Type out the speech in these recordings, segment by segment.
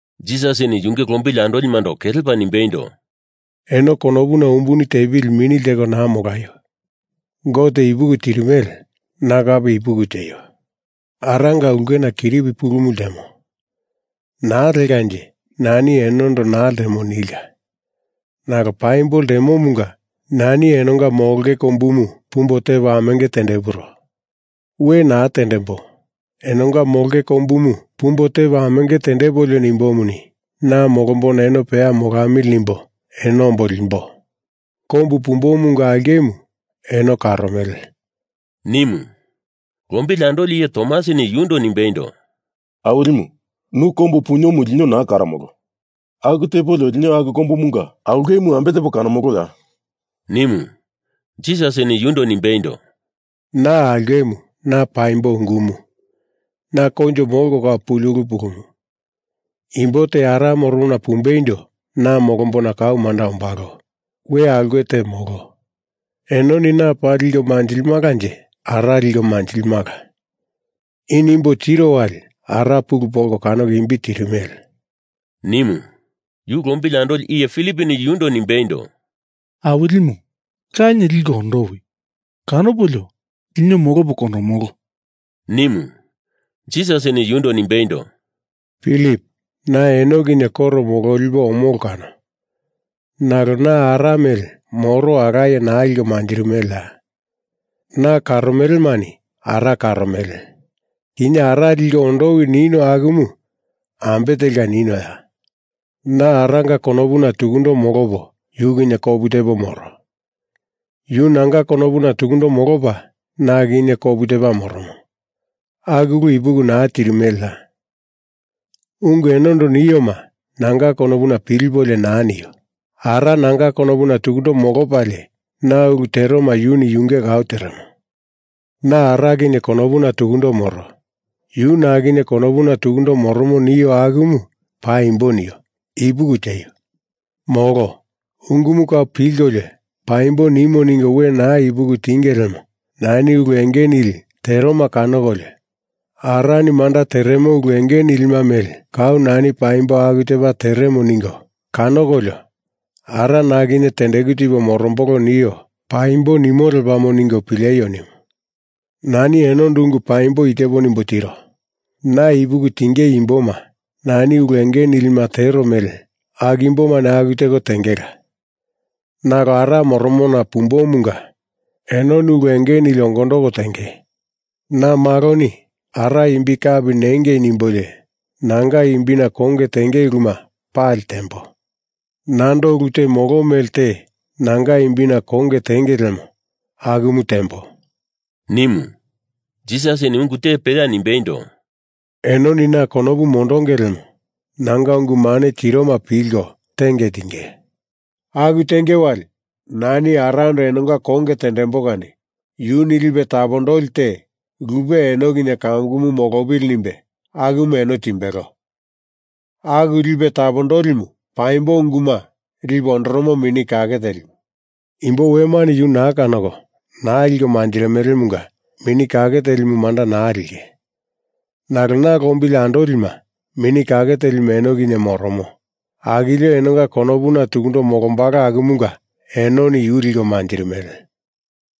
Jisasini yunge lombili andolimando kelepa nimbeindo, “Eno konopuna umbuni tepili mini lteko naa molaio! Gote ipuki tirimele. Na kape ipuki tieio. Aranga ulkena kiripi pulumu ltemo. Naa lekanje nani enondo naa ltemo nilka. Nalo paimbo ltemomunga nani enonga molongei kombumu pumbo tepo amenge tendepuro. We naa tendembo. Enonga molongei kombumu pumbo tepo amenge tendepolio nimbomuni, na molombona eno peya molamili nimbo eno ombo limbo. Kombu pumbomunga aulkemu eno karomele,” nimu. Lombili andoli iye Tomasini yundo nimbeindo, “Awilimu, nu kombu puniomu lino naa karomolo. Aku tepolio lino aku kombumunga aulkemu ambe tepo kanomoloya?” nimu. Jisasini yundo nimbeindo “Na aulkemu, na paimbo ungumu, na koinjo molko kau puli pulumu. Imbo te Ara moromona pumbeindo na molombona kau manda ombalo. We aulke te molo. Enoni na paa liko manjilimalanje Ara liko manjilimala. I nimbo tiro wali Ara pulu polko kanoko imbi tirimele,” nimu. Yu lombili andoli iye Filiponi yundo nimbeindo, “Awilimu, Lanie liko ondowi! Kanopolio lino molopo kondomolo,” nimu. Jisasini yundo nimbeindo, “Pilip, na eno kinye koro mololipo omolo kano nalo na Ara mele moro alaye naa liko manjirimeleya. Na karomelemani Ara karomele. Kinye Ara liko ondowi nino akumu ambe telka ninoya? Na Aranga konopuna tukundo molopo yu kinye kopu tepo moro, yu nanga konopuna tukundo molopa na kinye kopu tepa moromo. Aku ulu ipuki naa tirimeleya? Ungu enondo nioma nanga konopuna pilipolio naa nio. Ara nanga konopuna tukundo molopalie na ulu teroma yuni yunge kau teremo. Na Ara kinye konopuna tukundo moro, yu na kinye konopuna tukundo moromo nio akumu paimbo nio ipuki tieio! Molo ungumu kau pilkolio paimbo nimo ningo we naa ipuki tienge lemo nani ulu enge nili teroma kanokolio Arani manda teremo ulu enge nilima mele kau nani paimbo aku tepa teremo ningo kanokolio Ara na kinye tendeku tipo morombolo nio paimbo nimo lepamo ningo pileio nimu. Nani enondo ungu paimbo i tepo nimbo tiro. Na ipuki tinge imboma nani ulu enge nilima tero mele aku imbomani aku teko tengela. Nalo Ara moromona pumbomunga enoni ulu enge nili ongondoko tenge. Na Maloni Ara imbi kapi nengei nimbolio nanga imbina konge tenge uluma pali tembo. Nando ulu te molo mele te nanga imbina konge tenge lemo akumu tembo,” nimu. Jisasini ungu te peya nimbeindo, “Enoni na konopu mondonge lemo nanga ungu mane tiroma pilko tenge tinge. Aku tenge wali nani Arando enonga konge tendembo kani yuni Lipe Tapondoli te lupe eno kinye kamukumu molopili nimbe akumu eno timbelo. Aku Lipe Tapondolimu, Paimbo Unguma Lipe Ondoromo Mini Kake Telimu. Imbo wemani yu naa kanoko naa liko manjirimelemunga Mini Kake Telimu manda naa linge. Nalo na lombili andolima, Mini Kake Telimu eno kinye moromo, akilio enonga konopuna tukundo molombalo akumunga enoni yu liko manjirimele.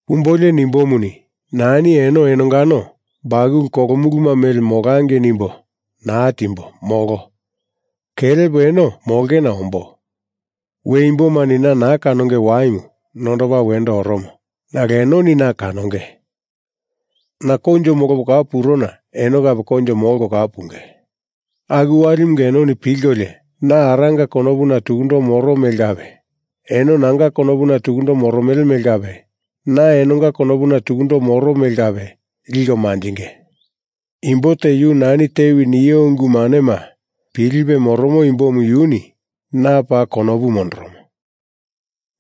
Pumbolio nimbomuni, nani eno enongano bakulu kolu muluma mele molangei nimbo naa timbo, molo. Kelepo eno molongena ombo. We imbomani na naa kanonge waimu nondopa wendo oromo. Nalo enoni na kanonge. Na koinjo molopo kau purona eno kape koinjo molko kau punge. Aku walimunga enoni pilkolio, na Aranga konopuna tukundo moro mele kape, eno nanga konopuna tukundo moromele mele kape, na enonga konopuna tukundo moro mele kape liko manjinge. Imbo te yu nani tewi nio ungu manema pilipe moromo imbomu yuni na paa konopu mondoromo.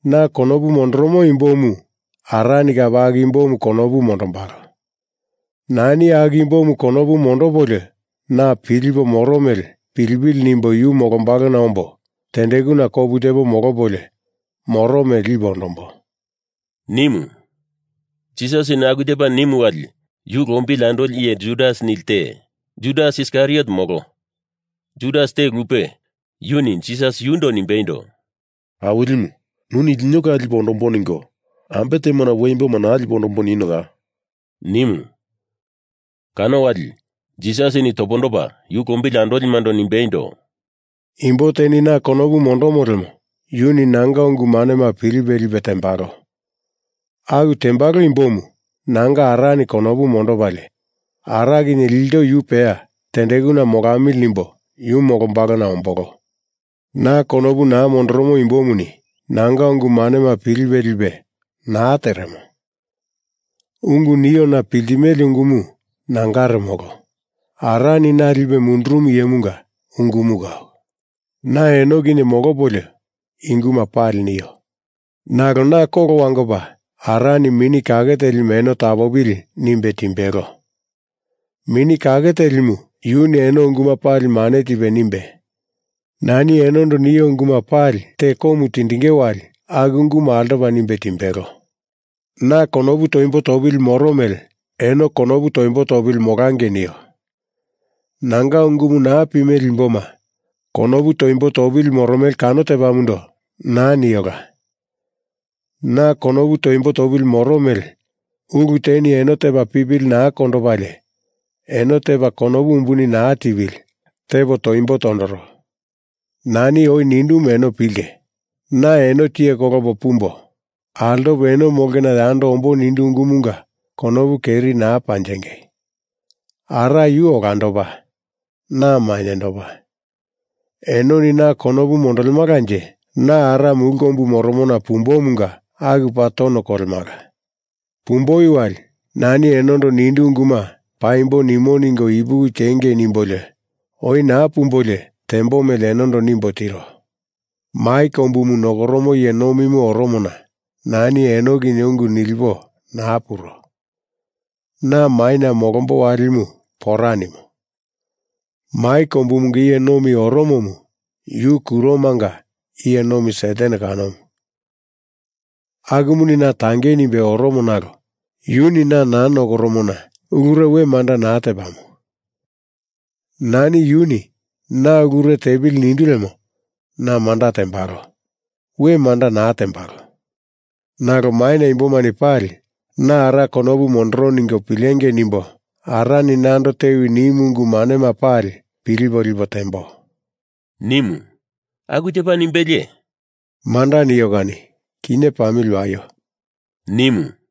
Na konopu mondoromo imbomu Arani kape aku imbomu konopu mondombalo. Nani aku imbomu konopu mondopolio na pilipo moro mele pilipili nimbo yu molombalona ombo tendekuna kopu tepo molopolio moro mele lipo ondombo,” nimu. Jisasini aku tepa nimu wali yu lombili andoli iye Judas nili te, Judas Iskariot molo, Judas te lupe, yuni Jisas yundo nimbeindo, “Awilimu, nuni lino kau lipo ondombo ningo, ambe temona we imboma naa lipo ondombo ninioya?” nimu. Kano wali Jisasini topondopa yu lombili andolimando nimbeindo, “Imbo teni na konopu mondomo lemo yuni nanga ungu manema pilipe lipe tembalo. Aku tembalo imbomu nanga Arani konopu mondopalie Ara kinye ilto yu peya tendekuna molamili nimbo yu molombalona ombolo. Na konopu naa mondoromo imbomuni nanga ungu manema pilipe lipe naa teremo. Ungu niona piltimele ungumu nangare molo. Arani na lipe mundurumu iyemunga ungumu kau. Na eno kinye molopolio i unguma pali nio. Nalo na kolo wangopa Arani Mini Kake Telimu eno tapopili nimbe timbelo. Mini Kake Telimu yuni eno unguma pali mane tipe nimbe, nani enondo nio unguma pali te komu tindinge wali aku ungumu altopa nimbe timbelo. Na konopu toimbo topili moro mele eno konopu toimbo topili molangei nio. Nanga ungumu naa pimele imboma konopu toimbo topili moromele kano tepamundo naa niola. Na konopu toimbo topili moro mele ulu teni eno tepa pipili naa kondopalie eno tepa konopu umbuni naa tipili tepo toimbo tondoro. Nani oi nindumu eno pilinge. Na eno tiye kolopo pumbo, altopo eno molongena yando ombo nindu ungumunga konopu keri naa panjingei. Ara yu olandopa na mainyendopa. Enoni na konopu mondolemalanje na Ara mulu kombu moromona pumbomunga aku paa tono kolemala. Pumboi wali nani enondo nindu unguma paimbo nimo ningo ipuki tiengei nimbolio oi naa pumbolio tembo mele enondo nimbo tiro. Mai kombumu nokoromo iye nomimu oromona nani eno kinye ungu nilipo naa puro. Na maina molombo walimu pora nimo. Mai kombumunga iye nomi oromomu yu kuromanga iye nomi Satan kanomu. Akumuni na tangei nimbe oromo nalo yuni na naa nokoromona ulure we manda naa tepamo. Nani yuni na ulure tepili nindu lemo na manda tembalo. We manda naa tembalo. Nalo maina imbomani pali na Ara konopu mondoro ningo pilengei nimbo Arani nando tewi nimu ungu manema pali pilipo lipo tembo,” nimu. Aku tepa nimbelie, “Manda nio kani kinye pamili waio,” nimu.